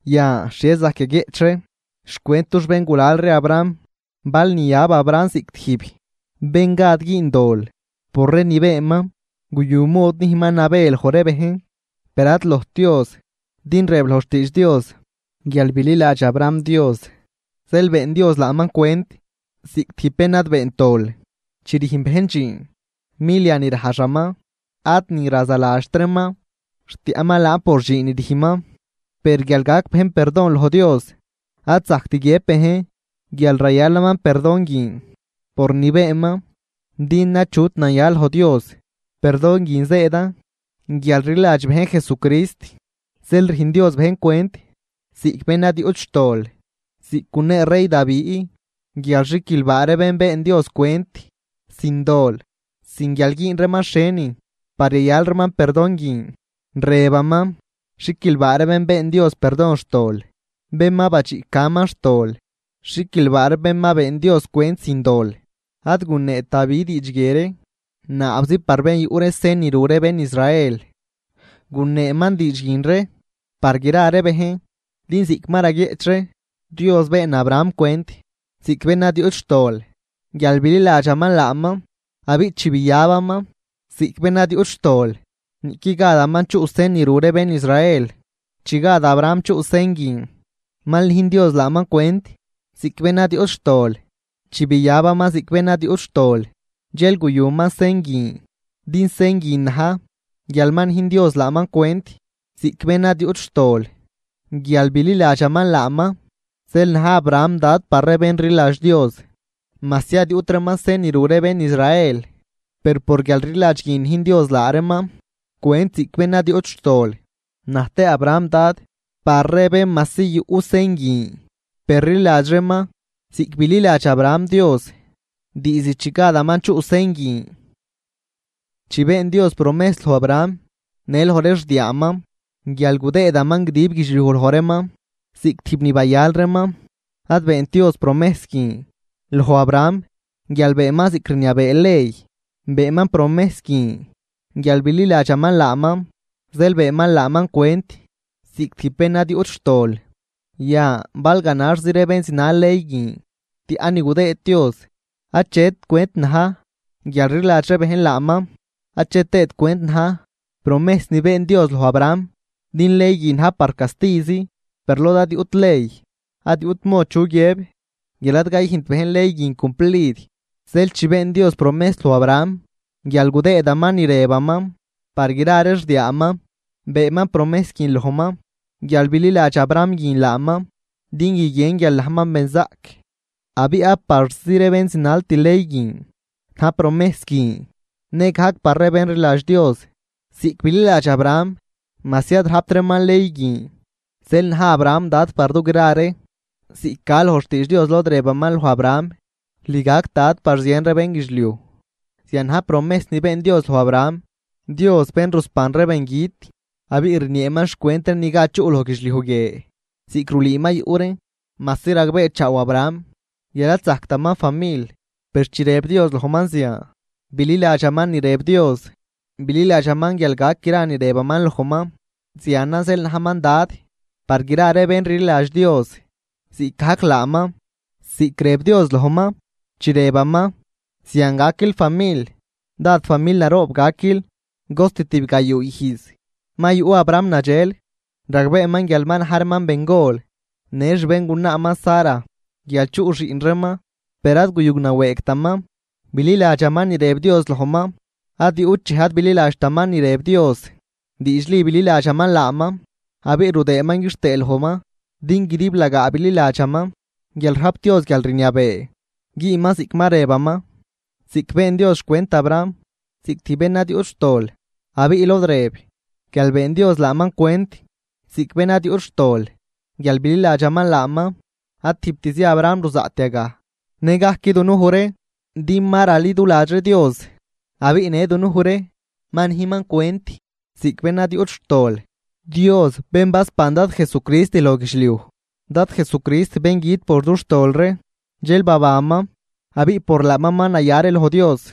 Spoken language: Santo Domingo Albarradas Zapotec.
Yan, ¿xhie zajc yaguieꞌch ree xcwent dux béngulal ree Abraham? Bal niyab Abraham ziꞌc tijb bén gad güün dol por ree ni beenman, guyu mod nüjnman nabë loj ree bejn, per ad lojt Dios. Din rëb loj xtiidx Dios: “Guial bililadx Abraham Dios, zeel been Dios laaman cwent ziꞌc tijb bén ad beent dol.” Chi rüjn bejn dxiin, milia ni rajxaman ad ni razaladxt reeman, rtiaꞌman laan por dxiin ni rüjnman. Per guial gac bejn perdon loj Dios, ad zajct guiëb bejn guial rayalaman perdon guin por ni beenman, din achut naya loj Dios. Perdon guin zëëdan guial rliladx bejn Jesucrist, zeel rüjn Dios bejn cwent ziꞌc bén ad yuꞌt xtol. Ziꞌc gunee rey Davi guial xiquilbaa ree bén been Dios cwent sin dol sin guial güün reeman xhienin par yayal reeman perdon guin. Rëbaman: Xiquilbaa ree bén been Dios perdon xtol, bén ma badxiꞌcaman xtol. Xiquilbaa ree bén ma been Dios cwent sin dol. Ad guneet Davi diidx guie ree naabzi par bén yuꞌ ree sen ni ru ree bén Israel, guneeman diidx guin ree par gra ree bejn. Din ziꞌc ma raguieꞌch ree, Dios been Abraham cwent ziꞌc bén ad yuꞌt xtol guial bililadxaman laaman. Abiꞌ chi biyabaman ziꞌc bén ad yuꞌt xtol, niꞌqui gadaman chuꞌ sen ni ru ree bén Israel, chi gad Abraham chuꞌ sen guin mal nüjn Dios laaman cwent ziꞌc bén ad yuꞌt xtol. Chi biabaman ziꞌc bén ad yuꞌt xtol, dxel guyuman sen guin din sen guin na̱j guial ma nüjn Dios laaman cwent ziꞌc bén ad yuꞌt xtol guial bililadxaman laaman. Zeel na̱j Abraham dad par ree bén rliladx Dios, majsi ad yuꞌt reeman sen ni ru ree bén Israel, per por guialrliladx guin nüjn Dios laa reeman cwent ziꞌc bén ad yuꞌt xtol. Naj tëë Abraham dad par ree bén majsi yuꞌ sen guin per rliladx reeman ziꞌc bililadx Abraham Dios diizd chi gadaman chuꞌ sen guin. Chi been Dios promejs loj Abraham në loj ree xdiaaman, guial gudëëdaman guidib guidxliuj loj reeman ziꞌc tijb ni bayal reeman, ad beent Dios promejs guin loj Abraham guial beenman ziꞌc rniabee ley, beenman promejs guin guial bililadxaman laaman, zeel beenman laaman cwent ziꞌc tijb bén ad yuꞌt xtol. Yan bal ganaxzi ree bén zinal ley guin tiaꞌ ni gudëë Dios, achet cwent na̱j guialrliladx ree bejn laaman, ache tëët cwent na̱j promejs ni been Dios loj Abraham. Din ley guin najn par castizi, per lod ad yuꞌt ley, ad yuꞌt mod chu guiëb guial ad cayüjnt bejn ley guin cumplid. Zeel chi been Dios promejs loj Abraham guial gudëëdaman ni rëbaman par gra ree xdiaaman, beenman promejs guin lojman guial bililadx Abraham guin laaman, din guiguien guial najman benzaꞌc abiꞌ ad parzi ree bén zinalt ley guin na̱j promejs guin, nëgajc par ree bén rliladx Dios ziꞌc bililadx Abraham majsi ad rajpt reeman ley guin. Zeel na̱j Abraham dad par dugra ree. Ziꞌc ca loj xtiidx Dios lod rëbaman loj Abraham: “Lüj gac dad par zien ree bénguidxliuj.” Zian na̱j promejs ni been Dios loj Abraham, Dios bén rusban ree bengüt abiꞌ rnieeman xcwent ree ni gad chuꞌ loj guidxliuj guie ziꞌc rulüü ma yuꞌ reen. Majsi ragbeechaaw Abraham guial ad zajctaman famil, per chi rëb Dios lojman zian, bililadxaman ni rëb Dios, bililadxaman guial gac gra ni rëbaman lojman. Zianan zeel najman dad par gra ree bén rliladx Dios ziꞌcgajc laaman. Ziꞌc rëb Dios lojman, chi rëbaman: “Zian gaquil famil, dád famil naroob gaquil.” Cost tibgayuu ijz ma yuꞌ Abraham nadxel, ragbeeman guial ma na̱j reeman bengol në xbéngunaaman Sara guial chuꞌ xiꞌn reeman, per ad guyunawëëgtaman, bililadxaman ni rëb Dios lojman. Ad yuꞌt dxej ad bililadxtaman ni rëb Dios. Diidxli bililadxaman laaman abiꞌ rudëëman quixtëë lojman, din guidiblagaa bililadxaman guial rajp Dios guialrniabee güünman ziꞌc ma rëbaman. Zeel been Dios cwent Abraham ziꞌc tijb bén ad yuꞌt xtol. Abiꞌ lod rëb guial been Dios laaman cwent ziꞌc bén ad yuꞌt xtol guial bililadxaman laaman, ad tijbtzi Abraham ruzaꞌt yagaj, nëgajc dunuj ree din ma raliduladx ree Dios. Abiꞌ në dunuj ree ma nüjnman cwent ziꞌc bén ad yuꞌt xtol, Dios bén basban Dad Jesucrist loj guialgüjt, Dad Jesucrist bén güt por dux tol ree, dxel babanman abiꞌ por laaman ma naya ree loj Dios.